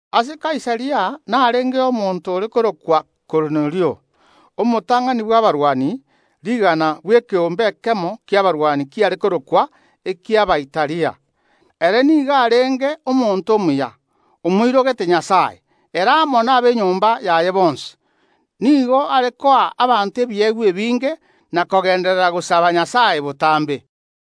Ase Kaisaria narengeo omonto oyomo ore korokwa Kornelio, omotang’ani bw’abarwani rigana bw’ekeombe ekemo ki’abarwani kiare korokwa Abaitalia. Ere nigo arenge omonto omuya, nere amo n’abanto b’enyomba yaye bonsi nigo bamoirogete Nyasae. Nigo are koa abanto ebiegwa ebinge n’omoyo oyomo na kogenderera gosaba Nyasae botambe.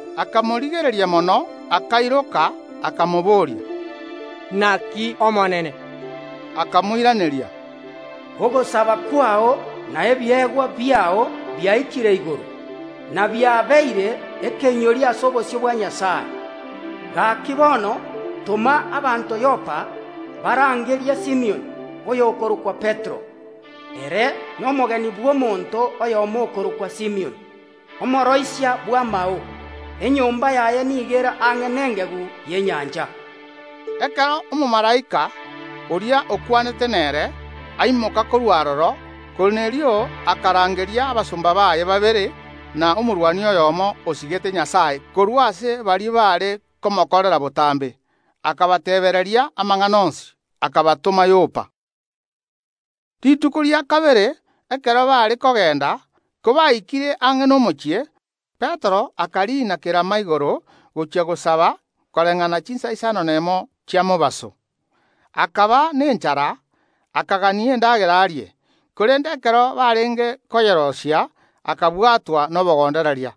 Akamorigereria mono, akairoka, akamobooria: “Naki Omonene?” Akamoiraneria: “Ogosaba kwao na ebiegwa biao biaikire igoro, na biabeire ekeinyorio ase obosio bwa Nyasae. Gaki, bono toma abanto Yopa barangerie Simioni, oyokorokwa Petero. Ere nomogeni bw’omonto oyomo okorokwa Simioni, omooroisia bw’amao; enyomba yaye nigo ere ang’e nengegu y’enyancha.” Ekero omomalaika, oria okwanete nere, aimoka korwa aroro, Kornelio akarangeria abasomba baye babere na omorwani oyomo osigete Nyasae korwa ase baria bare komokorera botambe, akabateebia amang’ana onsi, erio akabatoma Yopa. Rituko rikobwatia, ekero baare kogenda, kobaikire ang’e nomochie, Petero akariina kerama igoro gochia gosaba koreng’ana chinsa isano nemo chia mobaso. Akaba nenchara, akagania endagera arie. Korende ekero barenge koyeroisia, akabwatwa nobogondereria,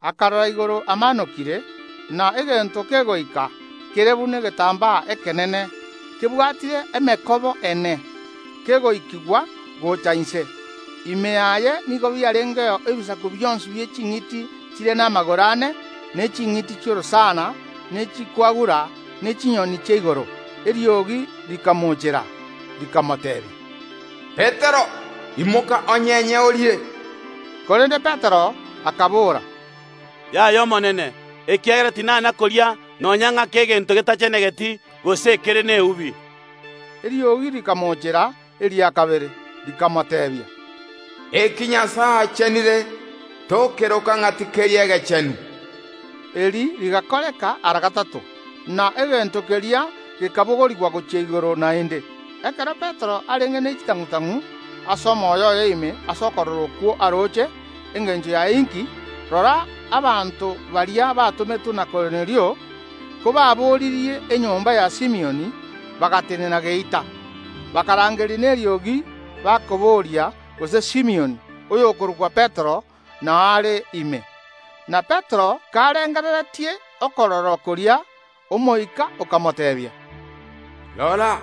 akarora igoro amaanokire, na egento kegoika, kere buna egetambaa ekenene, kebwatire emekoba ene, kegoikigwa gocha inse. Ime yaye nigo biarengeo ebisaku bionsi bie ching’iti chire namagoro ane, ne ching’iti chi’orosana, na echikwagura, ne chinyoni chia igoro. Eriogi rikamocheera, rikamoteebia: “Petero, imoka onyenye orie!” Korende Petero akabora: “Yay’Omonene, ekiagera tinana koria nonya ng’ake egento getachenegeti gose ekere neubi.” Eriogi rikamochera eria kabere, rikamoteebia: “Eki Nyasae achenire tokeroka ng’a tikeri egechenu.” Eri rigakoreka ara gatato, na egento keria gekabogorigwa gochia igoro naende. Ekero Petero arenge ne chitang’u‐tang’u ase omoyo oye ime ase okorora okwo aroche, engencho yaye inki, rora, abanto baria batometwe na Kornelio, kobaboririe enyomba ya Simioni, bagatenena geita. Bakarangeria neriogi bakabooria gose Simioni, oyokorokwa Petero, nao are ime. Na Petero, karengereretie okorora koria, Omoika okamoteebia: “Rora,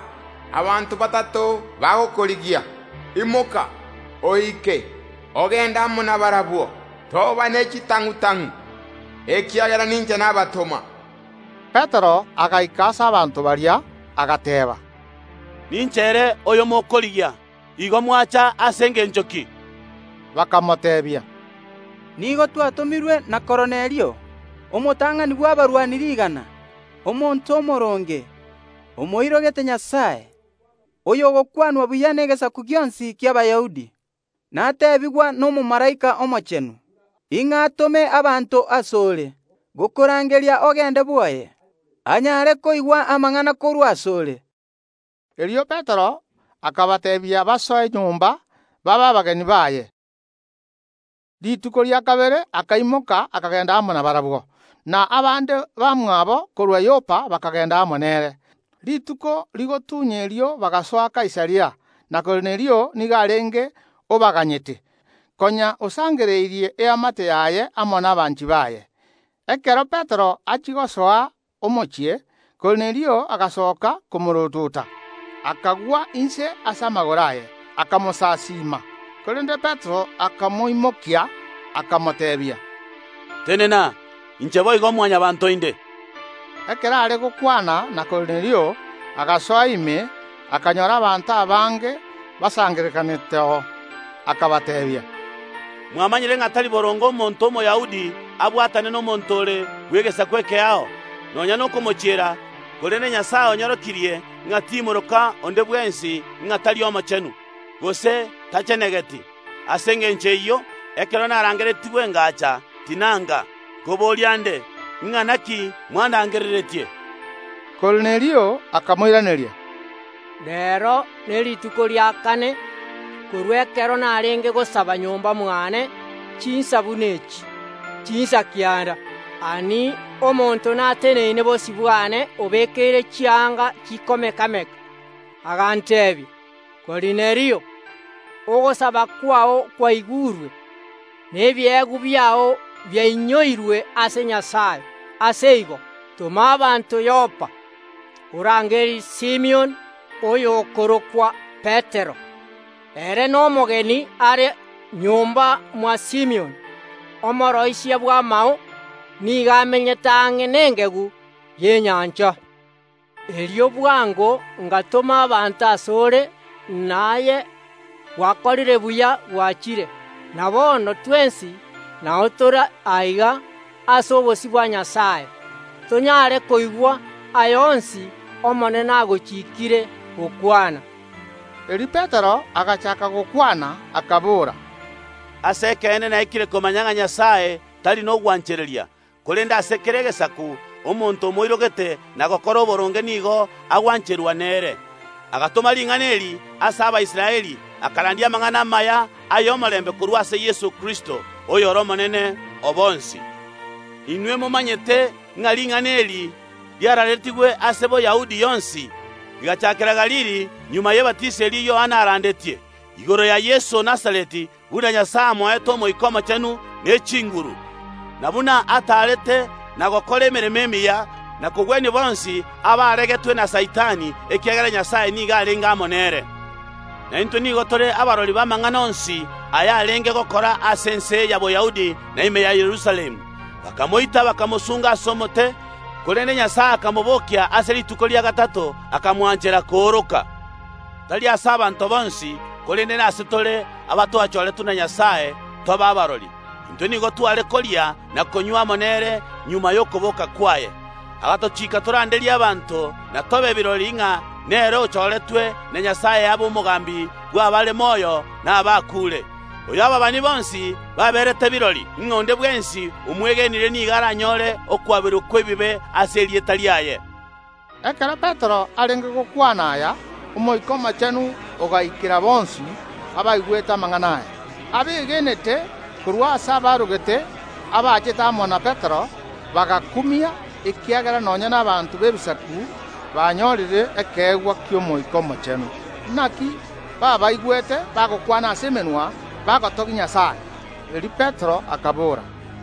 abanto batato bagokorigia. Imoka, oike, ogende amo nabarabwo, toba ne chitang’u‐tang’u ekiagera ninche nabatoma.” Petero agaika ase abanto baria, agateeba: “Ninche ere oyo mokorigia. Igo mwacha ase engencho ki?” Bakamoteebia: “Nigo twatomirwe na Kornelio, omotang’ani bw’abarwani rigana, omonto omooronge, omoirogete Nyasae, oyogokwanwa buya negesaku gionsi ki’Abayahudi. Nateebigwa n’omomalaika omochenu ng’a atome abanto ase ore gokorangeria ogende bwoye, anyare koigwa amang’ana korwa ase ore.” Erio Petero akabateebia basoe nyomba, babe abageni baye. Rituko rikobwatia akaimoka akagenda amo nabarabwo, na abande bamwabo korwa Yopa bakagenda amo nere. Rituko rigotunya erio bagasoa Kaisaria. Na Kornelio nigo arenge obaganyete, konya osangereirie eamate yaye amo nabanchi baye. Ekero Petero achia gosoa omochie, Kornelio agasoka komoorotota, akagwa inse ase amagoro aye, akamosasiima. Korende Petero akamoimokia, akamoteebia: “Tenena! Inche boigo Mwanyabaanto inde.” Ekero are gokwana na Kornelio, agasoa ime, akanyora abanto abange basangererekaneteo. Akabateebia: “Mwamanyire ng’a tari boronge omonto Omoyahudi abwatane nomonto ore bw’egesaku ekeao, nonya nokomochiera, korende Nyasae onyorokirie ng’a timoroka onde bwensi ng’a tari omochenu, gose tachenegeti. Ase engencho eyio, ekero narangeretigwe ngacha, tinaanga. Nkoboria nde: Ing’ana ki mwandangereretie?” Kornelio akamoiraneria: “Reero nerituko ria kane, korwa ekero narenge gosaba nyomba mwane chinsa buna echi, chinsa kianda. Ani! Omonto nateneine bosio bwane obekeire chianga chikomeka‐meka. Aganteebia: Kornelio, ogosaba kwao kwaigurwe, na ebiegwa biao biainyoirwe ase Nyasae. Ase igo, toma abanto Yopa, orangerie Simioni, oyokorokwa Petero; ere nomogeni are nyomba mwa Simioni, omooroisia bw’amao, nigo amenyete ang’e nengegu y’enyancha. Erio bwango ngatoma abanto orangerigwe, na aye gwakorire buya gwachire. Na bono twensi nao tore aiga ase obosio bwa Nyasae, tonyare koigwa aya onsi Omonene agochikiire gokwana.” Erio Petero agachaaka gokwana, akabora: “Ase ekeene naikire komanya ng’a Nyasae tari nogwanchereria, korende ase kera egesaku omonto omoirogete na gokora oboronge nigo agwancherwa nere. Agatoma ring’ana eri ase Abaisraeli, akarandia amang’ana amaya ay’omorembe korwa ase Yeso Kristo, oyore Omonene o bonsi. Inwe momanyete, ng’a ring’ana eri riaraaretigwe ase Boyahudi yonsi, rigachaakera Galili magega y’ebatiso eria Yohana arandetie, igoro ya Yeso o Nazareti, buna Nyasae amoete Omoika Omochenu ne chinguru, na buna ataarete na gokora emeremo emiya, na kogwenia bonsi abaregetwe na Saitani, ekiagera Nyasae nigo arenge amo nere. Na intwe nigo tore kirori b’amang’ana onsi aya arenge gokora ase ense y’Abayahudi na ime ya Yerusalemu. Bakamoita, bakamosunga ase omote, korende Nyasae akamobokia ase rituko ria gatato, akamwanchera kooroka, tari ase abanto bonsi, korende nasetore, abatwachoretwe na Nyasae tobe kirori. Intwe nigo tware koria na konywa amo nere magega y’okoboka kwaye. Agatochiika toranderie abanto, na tobe kirori ng’a nere ochoretwe na Nyasae abe omogambi bw’abare moyo na abakuure. Oyo ababani bonsi baberete kirori, ng’a onde bwensi omwegenire nigo aranyore okwaberwa kw’ebibe ase erieta riaye.” Ekero Petero arenge gokwana aya Omoika Omochenu ogaikera bonsi abaigwete amang’ana aya. Abegenete korwa ase abaarogete abachete amo na Petero, bagakumia, ekiagera nonya n’abanto b’Ebisaku banyorire ekeegwa ki’Omoika Omochenu. Naki baabaigwete bagokwana ase emenwa ao ao, bagotogia Nyasae. Erio Petero akabora,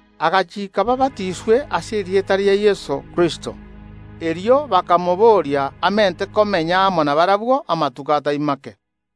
Agachiika baabatiswe ase erieta ria Yeso Kristo. Erio bakamobooria amente komenya amo nabarabwo amatuko atari make.